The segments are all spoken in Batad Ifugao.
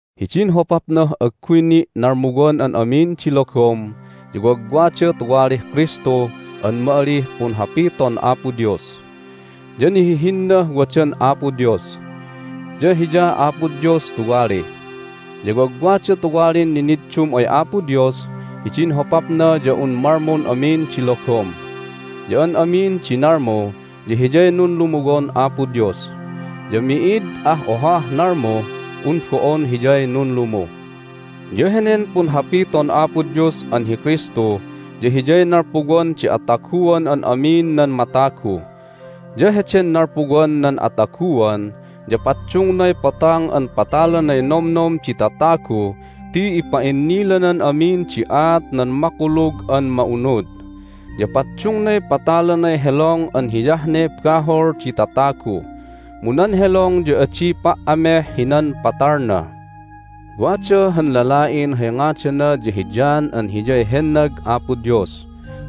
Hidin hopapnah agguy ni' nalmuwan an amin di logom ya wagwada tuwalih Kristu an ma'alih Punhapiton Apo Dios. Ya nihihinnah wadan Apo Dios, ya Hiyah Apo Dios tuwali. Ya wagwada tuwalin niniddum ay Apo Dios hidin hopapna ya un malmun amin di logom. Ya an amin di nalmu ya Hiyay nunlumuwon Apo Dios, ya mi'id ah ohah nalmuh un bo'on Hiyay nunlumu. Ya henen Punhapiton Apo Dios an hi Kristu ya Hiyay nalpuwan di ataguan an amin nan matagu. Ya heden nalpuwan nan ataguan ya paddungnay Potang an patalanay nomnom di tatagu ti ipa'innilanan amin di aat nan Makulug an Ma'unud. Ya paddungnay patalanay helong an hiyah ne bahol di tatagu, mu nan helong ya adi pa"ameh hinan patalna. Wada han lala'in hay ngadana ya hi John an hiyay hennag Apo Dios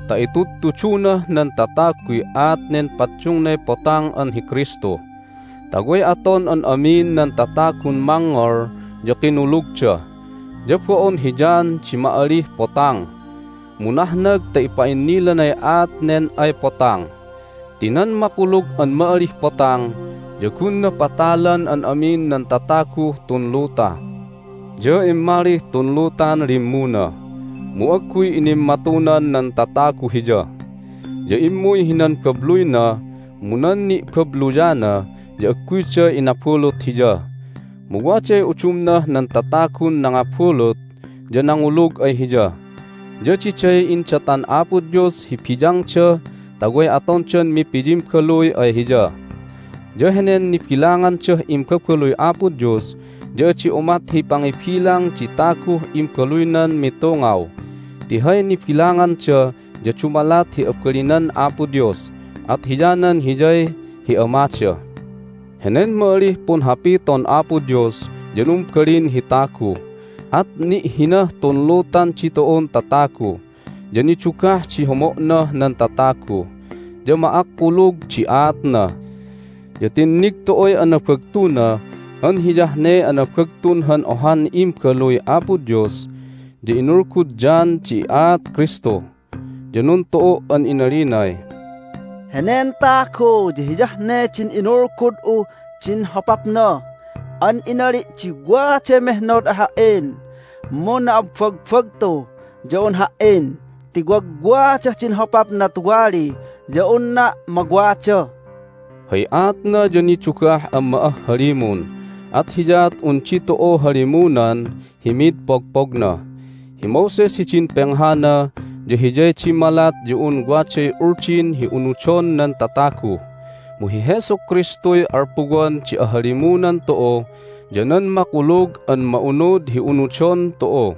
ta itudtudunah nan tataguy aat nen paddungnay Potang an hi Kristu, ta way aton an amin nan tatagun mangngol ya kinulugda. Ya bo'on hi John di ma'alih Potang, mu nahnag ta ipa'innilanay aat nen ay Potang. Ti nan makulug an ma'alih Potang ya gunna patalan an amin nan tataguh tun luta. Ya immalih tun lutan limmuna, mu agguy inimmatunan nan tatagu Hiya. Ya immuy hinan babluyna, mu nan ni'babluyana ya agguyda inabulut Hiya. Mu waday udumnah nan tatagun nangabulut ya nangulug ay Hiya, ya diday indatan Apo Dios hi biyangda ta way atondan mipiyimbaluy ay Hiya. Ya henen nibilangandah imbabaluy Apo Dios ya adi umat hi pangibilang di taguh imbaluynan mitungaw, ti hay nibilanganda ya dumalat hi abalinan Apo Dios, at hiyanan Hiyay hi Amada. Henen ma'alih Punhapiton Apo Dios ya numbalin hi tagu, at ni'hinah tun lutan ditu'un tatagu. Ya nidugah di homo'nah nan tatagu, ya ma'akkulug di aatna. Ya tinnig tu'uy anabagtuna an hiyah ne anabagtun han ohan Imbaluy Apo Dios. Ya inulgud John di aat Kristu, ya nuntu'u' an inalinay, "Henen tagu ya Hiyah ne din inulgud'uh din hopapna an inali' di, Waday mehnod ay ha"in, mu na'abbagbagtu ya un ha"in ti wagwadah din hopapna tuwali ya unna' mawada." Hay aatna ya nidugah an ma'ahhalimun, at hiyaat un ditu'u halimunan hi mid pogpogna. Hi Moses hidin penghana ya hiyay dimmalat ya un waday Uldin hi unudon nan tatagu, mu hi Jesu Kristuy alpuwan di ahalimunan tu'u ya nan Makulug an Ma'unud hi unudon tu'u.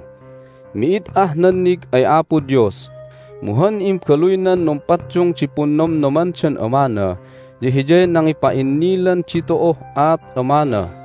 Mi'id ah nannig ay Apo Dios, mu han imbaluynan numpaddung di punnomnomandan Amana ya Hiyay nangipa'innilan ditu'uh aat Amana.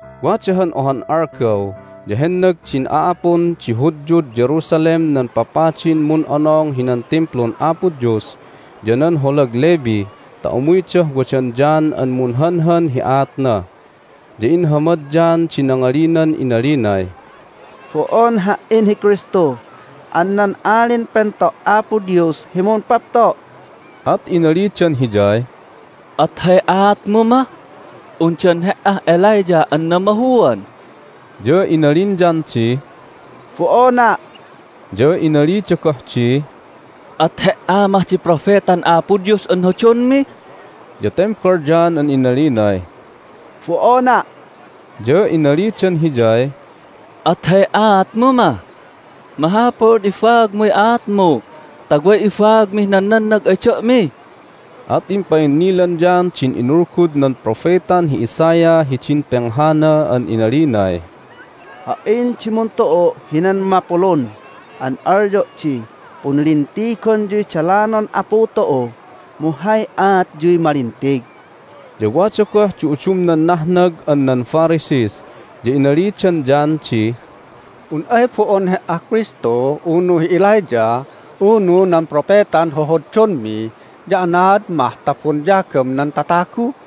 Wada han ohan algaw ya hennag din a'apun di Hudyud Jerusalem nan papadin mun'onong hinan Timplun Apo Dios ya nan holag Levi ta umuydah wadan John an munhanhan hi aatna. Ya inhamad John di nangalinan inalinay, "Bo'on ha"in hi Kristu an nan Alin Pento' Apo Dios hi mumpapto'!" At inalidan hiyay, "At hay aatmu mah? Undan he"ah Elijah an namahuan?" Ya inalin John di, "Bo'ona'!" Ya inalida goh di, "At he"a mah di Propetan Apo Dios an hodonmi?" Ya tembal John an inalinay, "Bo'ona'!" Ya inalidan hiyay, "At hay aatmu mah? Mahapul an ibaagmuy aatmu ta way ibagamih nan nannag ay da'mi!" At impa'innilan John din inulgud nan propetan hi Isaiah hidin penghana an inalinay, "Ha"in di muntu'u' hinan mapulun an alyo' di, Punlintigonyuy dalanon Apu tu'u, mu hay aatyuy malintig." Ya wada goh di udumnan nahnag an nan Pharisees, ya inalidan John di, "Un ay bo'on he"ah Kristu, unu hi Elijah, unu nan Propetan hohoddonmi ya anaad mah ta bonyagam nan tatagu?"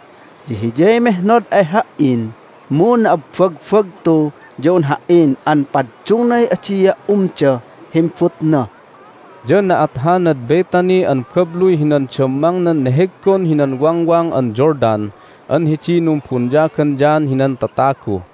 Ya Hiyay mehnod ay ha"in, mu na'abbagbagtu ya un ha"in an paddungnay adia' umdah himbutna." Ya na'at hanad Bethany an babluy hinan dammangnan neheggon hinan Wangwang an Jordan an hidiy numbonyagan John hinan tatagu.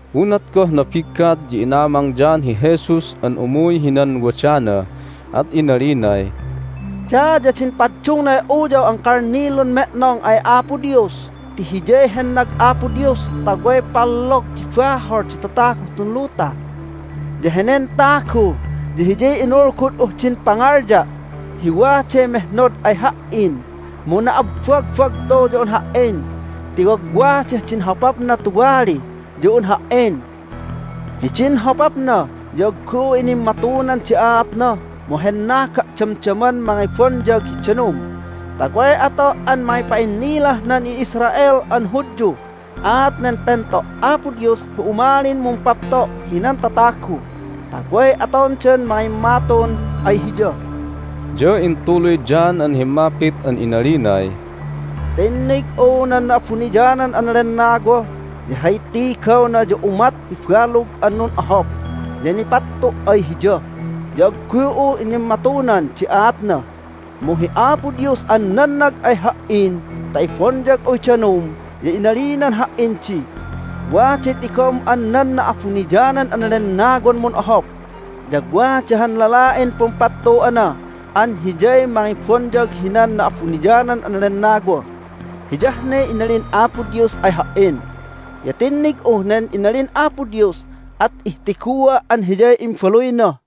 Unat goh nabiggat ya inamang John hi Jesus an umuy hinan wadana, at inalinay, "Daya din paddungnay Uyaw an Kalnilun Me'nong ay Apo Dios ti Hiyay hennag Apo Dios ta way pallog di bahol di tataguh tun luta! Ya henen tagu ya Hiyay inulgud'uh din pangalya' hi, Waday mehnod ay ha"in, mu na'abbagbagtu ya un ha"in ti wagwadah din hopapna tuwali ya un ha"in. Hidin hopapna ya agguy'u inimmatunan di aatna, mu hennaga' damdaman mangibonyag hi danum ta way ato' an mangipa'innilah nan i'Israel an Hudyuh aat nen Pento' Apo Dios hi umalin mumpapto' hinan tatagu, ta way atondan mangimmatun ay Hiya." Ya intuluy John an himmapit an inalinay, "Tinnig'u nan Na'abuniyanan an Lennawa, ya hay tigawna ya umat hi balug an nun'ohop, ya nipattu' ay Hiya. Ya agguy'u inimmatunan di aatna, mu hi Apo Dios an nannag ay ha"in ta ibonyag'uy danum ya inalinan ha"in di, Waday tigom an nan Na'abuniyanan an Lennawan mun'ohop, ya wada han lala'in pumpattu'ana an Hiyay mangibonyag hinan Na'abuniyanan an Lennawa. Hiyah ne inalin Apo Dios ay ha"in. Ya tinnig'uh nen inalin Apo Dios, at ihtigua' an Hiyay Imbaluyna."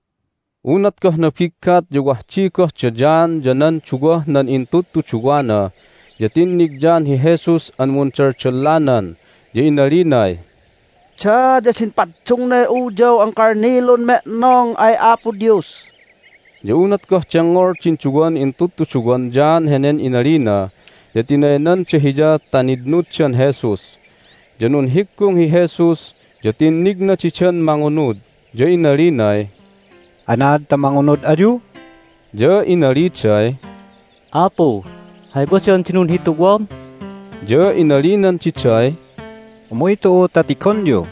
Unat goh nabiggat ya wah di goh da John ya nan duwah nan intudtuduwana. Ya tinnig John hi Jesus an mundaldallanan, ya inalinay, "Daya din paddungnay Uyaw an Kalnilun Me'nong ay Apo Dios!" Ya unat goh dengngol din duwan intudtuduwan John henen inalina ya tinaynanda hiya ta nitnuddan Jesus. Ya nunhiggung hi Jesus, ya tinnigna didan mangunud, ya inalinay, "Anaad ta mangunud ayu?" Ya inaliday, "Apu, hay wadan di nunhituwam?" Ya inalinan diday, "Umuy tu'u ta tigonyu."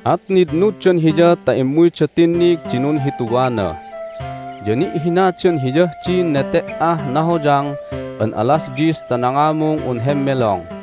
At nitnuddan Hiya ta immuyda tinnig di nunhituwana. Ya ni'hinadan Hiyah din nete"ah nahoyang an alas dyis ta nangamung un hemmelong.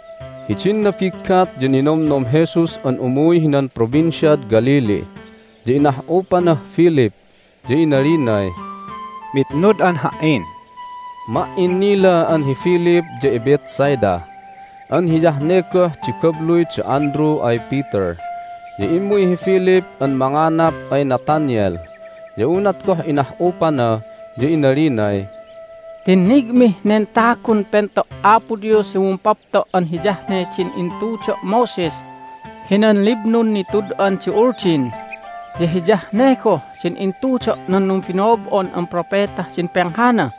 Hidin nabiggat ya ninomnom Jesus an umuy hinan Provinciad Galilee. Ya inah'upanah Philip, ya inalinay, "Mitnud'an Ha"in." (Ma"innila an hi Philip ya iBethsaida an hiyah ne goh di babluy da Andrew ay Peter). Ya immuy hi Philip an manganap ay Nathanael. Ya unat goh inah'upana ya inalinay, "Tinnigmih nen tagun Pento' Apo Dios hi mumpapto' an hiyah ne din intudo' Moses hinan liblun nitud'an di Uldin, ya hiyah ne goh din intudo' nan numbino'ob'on an propetah din penghana!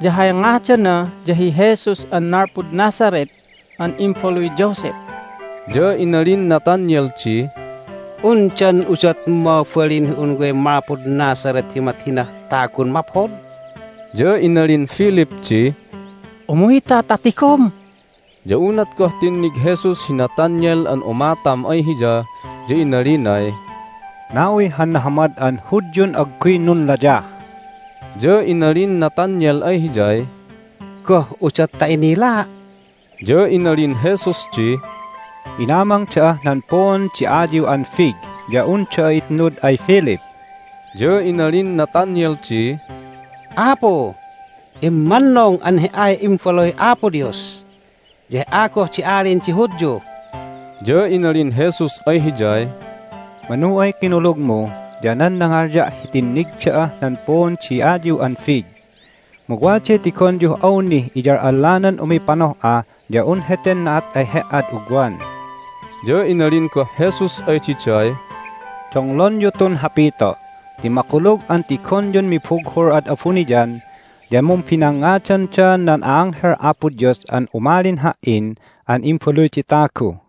Ya hay ngadana ya hi Jesus an nalpud Nazareth an imbaluy Joseph!" Ya inalin Nathanael di, "Undan udot mabalin hi un way malpud Nazareth hi umat hinah tagun maphod?" Ya inalin Philip di, "Umuyta ta tigom!" Ya unat goh tinnig Jesus hi Nathanael an umatam ay Hiya ya inalinay, "Na'uy han nahamad an Hudyun agguy nunlayah!" Ya inalin Nathanael ay Hiyay, "Goh udot ta inilaa'?" Ya inalin Jesus di, "Inamang da'ah nan puun di ayiw an fig ya un da'a itnud ay Philip." Ya inalin Nathanael di, "Apu, immannung an He"ay Imbaluy Apo Dios, ya He"a goh di Alin di Hudyu!" Ya inalin Jesus ay hiyay, "Manu ay kinulugmu ya nan nangalya' hi tinnig da'ah nan puun di ayiw an fig. Mu waday tigonyuh awnih iyal'allanan umipanoh'a ya un heten na'at ay he"ad ugwan." Ya inalin goh Jesus ay diday, "Donglonyu tun hapito' ti makulug an tigonyun mibughul ad abuniyan, ya mumbinangngadanda nan a'anghel Apo Dios an umalin Ha"in an Imbaluy di Tagu!"